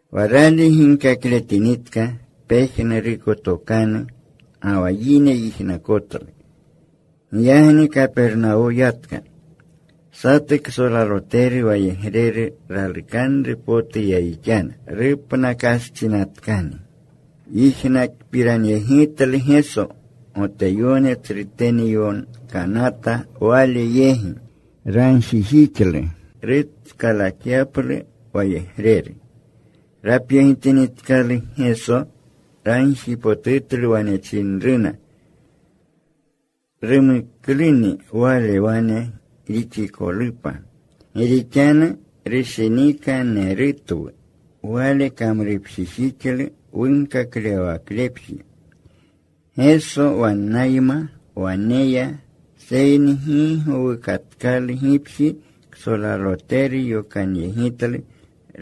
Wa rali ginkakletinitka pejnuruko tokanu ga wa yine yijnakotlu. Giyagni Kapernawo yatka. Satu ksolaloteru wayegreru ralukanru potu yayixyana. Rupnakastsinatkani. Yijnakpiranyegitlu Geso. Goteyone tsrutene yokanata Wale yegi. Ragjijixlu rutskalatyaplu wayegreru. Rapyegitinitkaluna Geso, ragjipotutluna. Wane chinruna, “Rumukluni wale wane rixikolupa. Gi rixanu rushinikanerutwu. Wale kamrupjijixlu wunkaklewawaklepji.” Geso wannayma wane ya. Seyni gi gowukatkalu gipji, ksolaloteru yokanyegitlu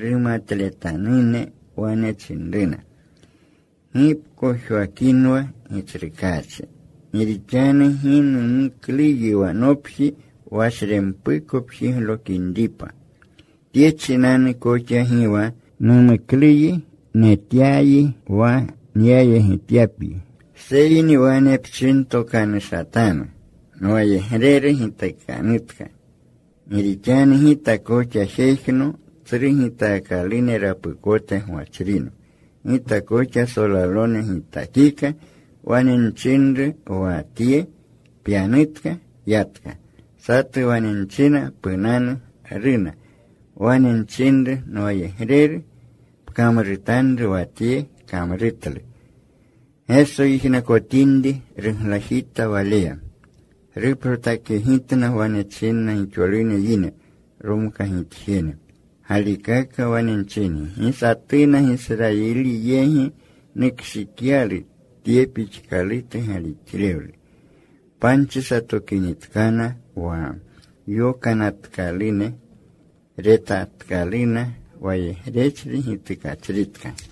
rumatletanune. Wane chinruna, “Gi pkojwakinwa, Gitsrukaachi. Gi rixanu gi numukluyi wa nopji washrempuko pjiglokinripa. Tye chinanu koxa gi wa numukluyi netyayi wa nyayegityapyi. Seyni wane pchintokanushatanu. Nwayegreru gitukanutka. Gi rixanu gita koxa jejno tsru gitaakalune rapukote gwachrino. Gita koxa solalone gitakika. Wane nchinru wa tye, ‘Pyanutka.’ Yatka. Satu wane nchina, ‘Punanu,’ Runa. Wane nchinru nwayegreru, ‘Pkamrutanru wa tye,’ Kamrutlu.” Geso yijnakotinri, ruglajita waleya. Ruprotakyegitna. Wane chinna gixolune yine romkagitjene, “Galikaka wane nchingi, gi satuna Gisrayiline yegi nukshikyalu tye pixkalutu galixlewlu.” Panchi satokinitkana wa yokanatkalune, retatkaluna wayegrechri gitukachritka.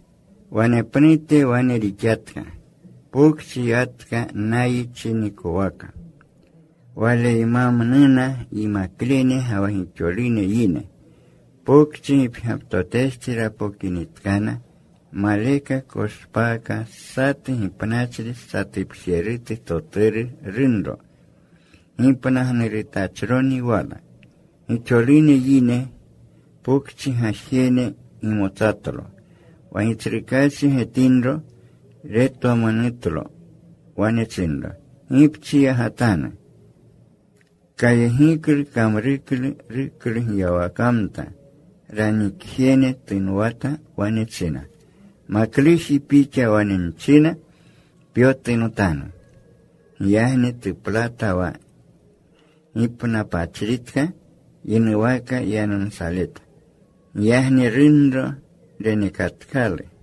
Wanepnute wane rixatka. Pokchi yatka Nayi chinikowaka. Waleymamnuna yimaklene ga wa gixolune yine. Pokchi gipgyaptotestsi rapokinitkana, maleka koshpaaka satu gipnachri satupjerutu toturu runro. Gipnagnurutachroni wala. Gixolune yine pokchi gajene gimotsatlo. Wa Gitsrukaachi getinro, retwamonutlo. Wane chinro, “Gi pchiyagatanu.” Kayegiklu. Kamruklu ruklugyawakamta. Ranikjene tunwata. Wane china, “Makluji, pixa wane nchina, pyotunotanu.” Giyagni tuplata wa gipnapachritka. Yinuwaka yanumsaleta. Giyagni runro renekatkalu.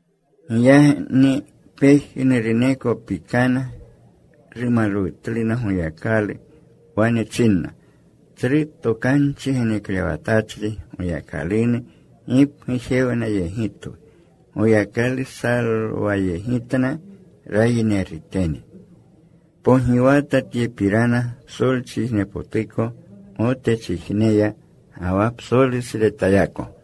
Giyagni pejnuruneko pikana. Rumalwutluna Goyakalu. Wane chinna, “Tsru tokanchi geneklewatachri Goyakalunu gipgujewnayegitwu. Goyakalu salwayegitna rayinerutene.” Pogiwata tyepirana psolchijnepotuko Gotechijneya ga wa psolusretayako.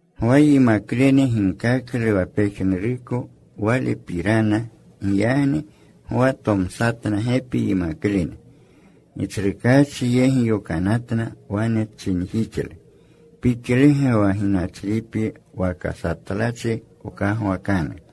Gwa yimaklene ginkaklu wa pejnuruko Walepirana. Giyagni Gwa tomsatna gepi yimaklene. Gitsrukaachi yegi yokanatna. Wane chinjixlu, “¿Pixlege wa ginachripyi, waka satlachi wkagwakanu?”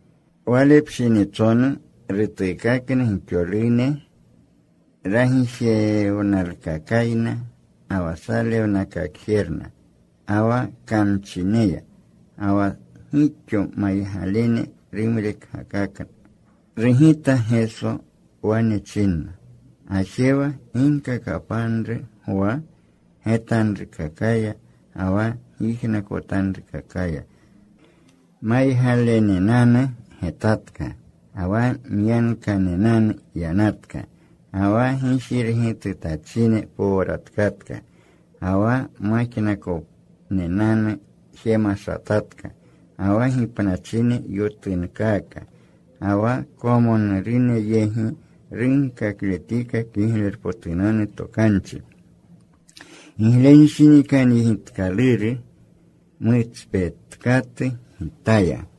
Wale pshinitsonu rutuukakna gixolune ragijewnalkakayna, ga wa salewnakakjerna, ga wa kamchineya. Ga wa gixo maygalene rumrekgakakna. Rugita Geso. Wane chinna, “Gajewa. Ginkakapanru Gwa getanrukakaya ga wa gyijnakotanrukakaya: Maygalenenanu getatka. Ga wa myankanenanu yanatka. Ga wa gijirgitunatachine powratkatka. Ga wa majnakonenanu jemashatatka. Ga wa gipnachine yotunkaaka. Ga wa kwamonurune yegi runkakletika Kiglerpotunanu Tokanchi. Giglenshinikanyegitkaluru mutspetkatu Gitaya.”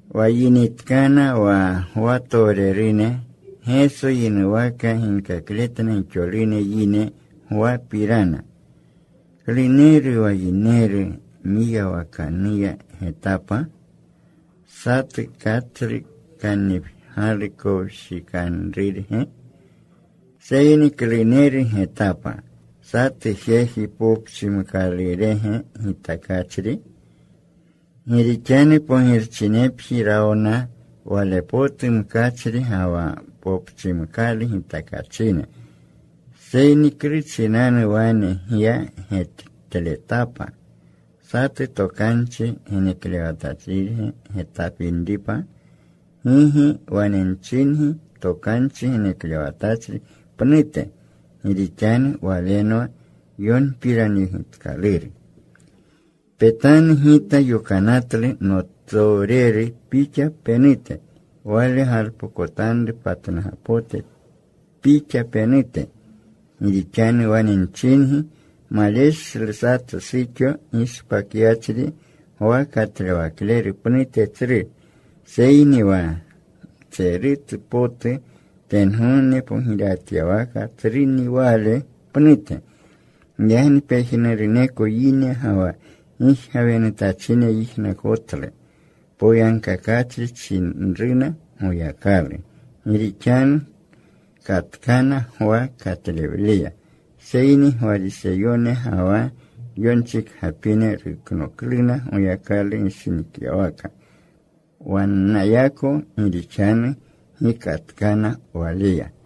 Wa yinitkana wa Gwatowrene, Geso yinuwaka ginkakletna gixolune yine Gwapirana, “¿Kluneru wa yineru mwiyawakanuwa getapa? ¿Satu katslu kannipgyalu kowshikanrurge? Seyni ¿kluneru getapa? ¿Satu jeji popchimkalurege gitakachri? Gi rixanu pogirchinepji rawna wale potu mkachri ga wa popchimkalu gitakachine. Seyni ¿klu chinanu wane gya getletapa? ¿Satu tokanchi geneklewatachrirge getapinripa? Gigi, wane nchingi. Tokanchi geneklewatachri pnute. Gi rixanu walenwa yonpiranyegitkaluru: Petanu. Gita yokanatlu notowreru Pixa penute. Wale galpokotanru patnugapote Pixa penute. “Gi rixanu wane nchingi, maleshlu satu suxo gishpakyachri Gwa Katlewakleru pnute tsru. Seyni wa mtserutu potu tengogne pogirewatyawakaya tsruni wale pnute.” Giyagni pejnuruneko yine ga wa gijgawenutachine yijnakonatlu. Poyagkakachri chinruna Goyakalu, gi rixanu katkana Gwa katlewleya. Seyni wa Gwariseyone ga wa yonchikgapine ruknokluna Goyakalu gishinikyawaka wannayako, gi rixanu gi katkana waleya.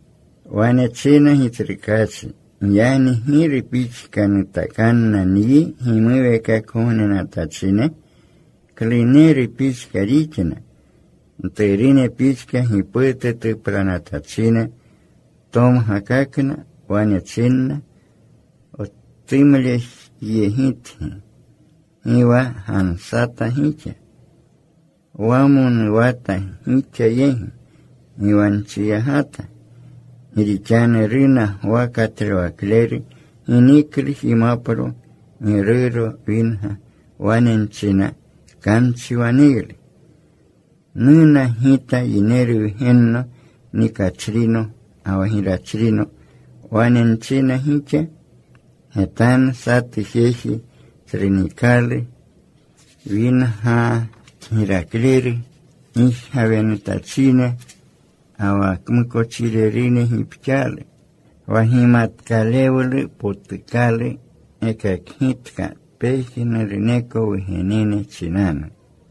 Wane china Gitsrukaachi, “Giyagni ¿giru pixka nutakanna nyi gimuweekakgognenatachine? ¿Kluneru pixka rixna? Mturune pixka, giputu tuplanatachine. Tomgakakna. Wane chinna: Wtumlejyegitgi. Gi wa gansata gixa. Wamonuwata gixa yegi. Gi wa nchiyagata. “Gi rixanu runa Gwa Katlewakleru. Gi niklu jimapro. Gi ruuro winga. Wane nchina, ‘Kamchi waneylu.’ Nuna Gita Yineru Wgenno. Nikachrino ga wa girachrino. Wane nchina gixa, ‘Getanu. Satu jeji tsru nikalu. Winga kgirakleru. Gijgawenutachine ga wa kmukochirerune gipxaalu.’ Wa gimatkalewlu potukalu gekakgitka pejnuruneko wugenene chinanu.”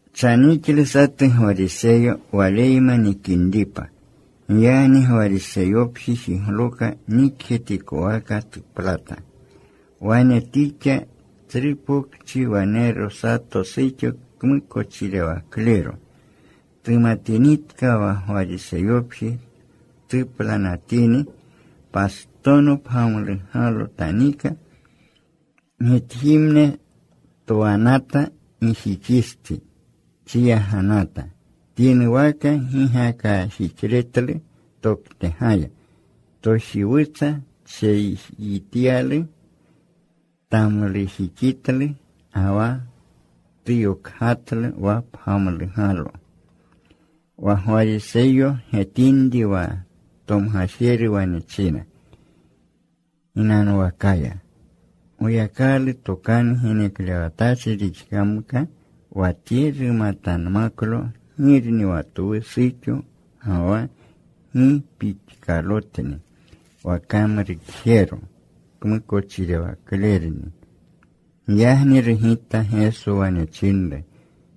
Chanixlu satu Gwariseyo waleyma nikinripa. Giyagni Gwariseyopji jigloka. Nikjetikowaka tuplata. Wane tixa. Tsru pokchi wanero sato suxo kmukochirewaklero. Tumatinitka wa Gwariseyopji tuplanatini, pastono pgamlugalo tanika. Gitjimne twanata gijixistsi. Chiyaganata. Tyinuwaka gigakajixletlu toktegaya. Tojiwutsa tsheyityalu. Tamlujixitlu. Ga wa tuyokgatlu wa pgamlugalo. Wa Gwariseyo getinri, wa tomgajeru wane china ginanwakaya, “Goyakalu tokanu geneklewatachri rixkamka wa tye, rumatanmaklo girni wa twu suxo ga wa gi pixkalotni wa kamrukjero. Kmukochirewaklerni.” Giyagni rugita Geso. Wane chinru,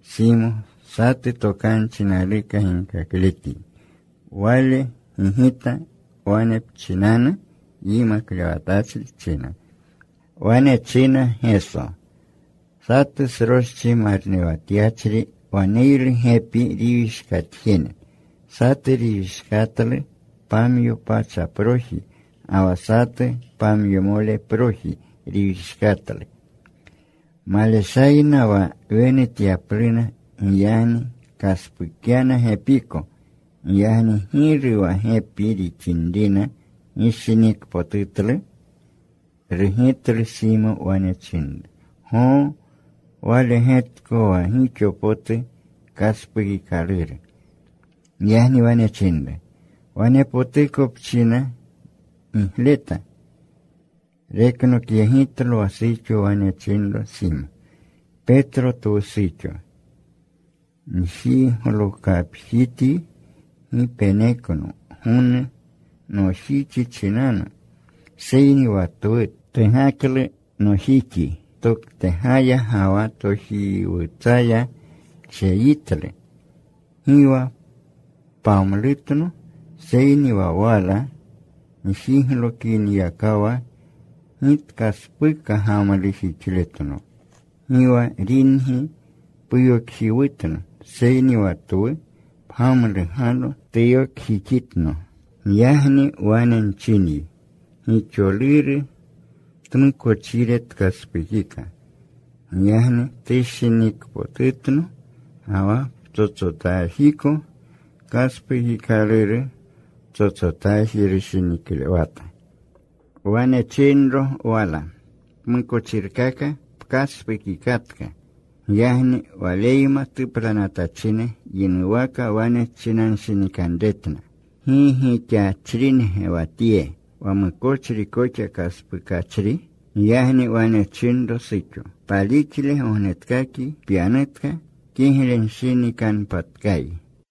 “Simo. Satu tokanchi naluka ginkakletyi.” Wale gigita, “Wane pchinanu, Yimaklewatachri,” china. Wane china Geso, “Satu sroschi marnewatyachri waneylu gepi riwishkatjene. Satu riwishkatlu pamyo pachaproji. Ga wa satu, pamyomoleproji riwishkatlu. Maleshayna wa wenutyapluna. Giyagni kaspukyana gepiko. Giyagni ¿giru wa gepi rixinrina gishinikpotutlu?” Rugitlu Simo. Wane chinru, “Goo. Wale getko wa gixo potu kaspukikaluru.” Giyagni wane chinru, “Wane potuko pchina gigleta.” Reknokyegitlo wa suxo. Wane chinru Simo, “Petlo twu suxo. Njiglokapjityi. Gi penekno gonu nojixi chinanu. Seyni wa twu tugaklu nojixi toktegaya ga wa tojiwutsaya tsheyitlu. Gi wa pamlutno. Seyni wa wala njiglokiniyakawa gi tkaspuka gamlujixletno. Gi wa ringi puyokjiwutno, seyni wa twu pgamlugalo tuyokjixitno. Giyagni wane nchinyi, gixoluru tmukochire tkaspukika. Giyagni tushinikpotutno. Ga wa ptsotsotajiko kaspukikaluru ptsotsotaji rushiniklewata.” Wane chinro wala, “Pmukochirkaka pkaspukikatka.” Giyagni Waleyma tuplanatachine yinuwaka wane chinanshinikanretna, “¿Gi gixachringe wa Tye, wa mukochri koxa kaspukachri?” Giyagni wane chinro suxo, “Palixle gognetkakyi. Pyanutka. Kiglenshinikanpatkayi.”